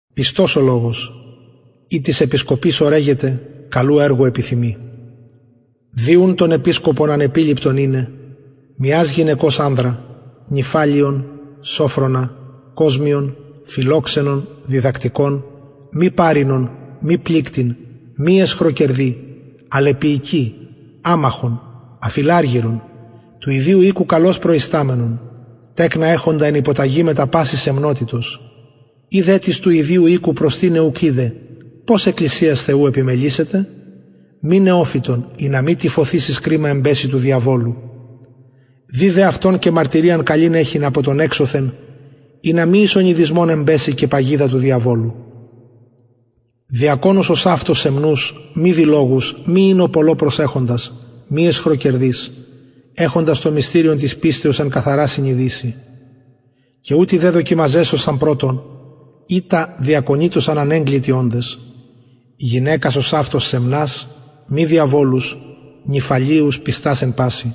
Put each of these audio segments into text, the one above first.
πιστος ο λογος ει τις επισκοπης ορεγεται καλου εργου επιθυμει δει ουν τον επισκοπον ανεπιληπτον ειναι μιας γυναικος ανδρα νηφαλεον σωφρονα κοσμιον φιλοξενον διδακτικον μη παροινον μη πληκτην μη αισχροκερδη αλλ επιεικη αμαχον αφιλαργυρον του ιδιου οικου καλως προισταμενον τεκνα εχοντα εν υποταγη μετα πασης σεμνοτητος ει δε τις του ιδιου οικου προστηναι ουκ οιδεν πως εκκλησιας θεου επιμελησεται μη νεοφυτον ινα μη τυφωθεις εις κριμα εμπεση του διαβολου δει δε αυτον και μαρτυριαν καλην εχειν απο των εξωθεν ινα μη εις ονειδισμον εμπεση και παγιδα του διαβολου διακονους ωσαυτως σεμνους μη διλογους μη οινω πολλω προσεχοντας μη αισχροκερδεις εχοντας το μυστηριον της πιστεως εν καθαρα συνειδησει και ουτοι δε δοκιμαζεσθωσαν πρωτον ειτα διακονειτωσαν ανεγκλητοι οντες γυναικας ωσαυτως σεμνας μη διαβολους νηφαλεους πιστας εν πασιν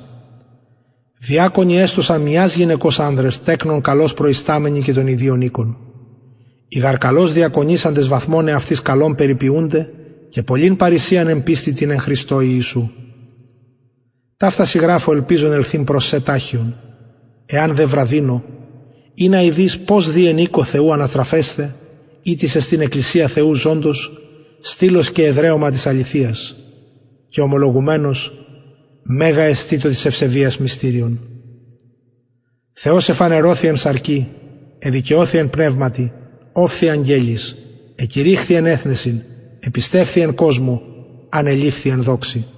διακονοι εστωσαν μιας γυναικος ανδρες τεκνων καλως προισταμενοι και των ιδιων οικων οι γαρ καλως διακονησαντες βαθμον εαυτοις καλον περιποιουνται και πολλην παρρησιαν εν πιστει τη εν χριστω ιησου ταυτα σοι γραφω ελπιζων ελθειν προς σε ταχιον εαν δε βραδυνω ινα ειδης πως δει εν οικω θεου αναστρεφεσθαι ητις εστιν εκκλησια θεου ζωντος στυλος και εδραιωμα της αληθειας και ομολογουμενως μεγα εστιν το της ευσεβειας μυστηριον θεος εφανερωθη εν σαρκι εδικαιωθη εν πνευματι ωφθη αγγελοις εκηρυχθη εν εθνεσιν επιστευθη εν κοσμω ανεληφθη εν δοξη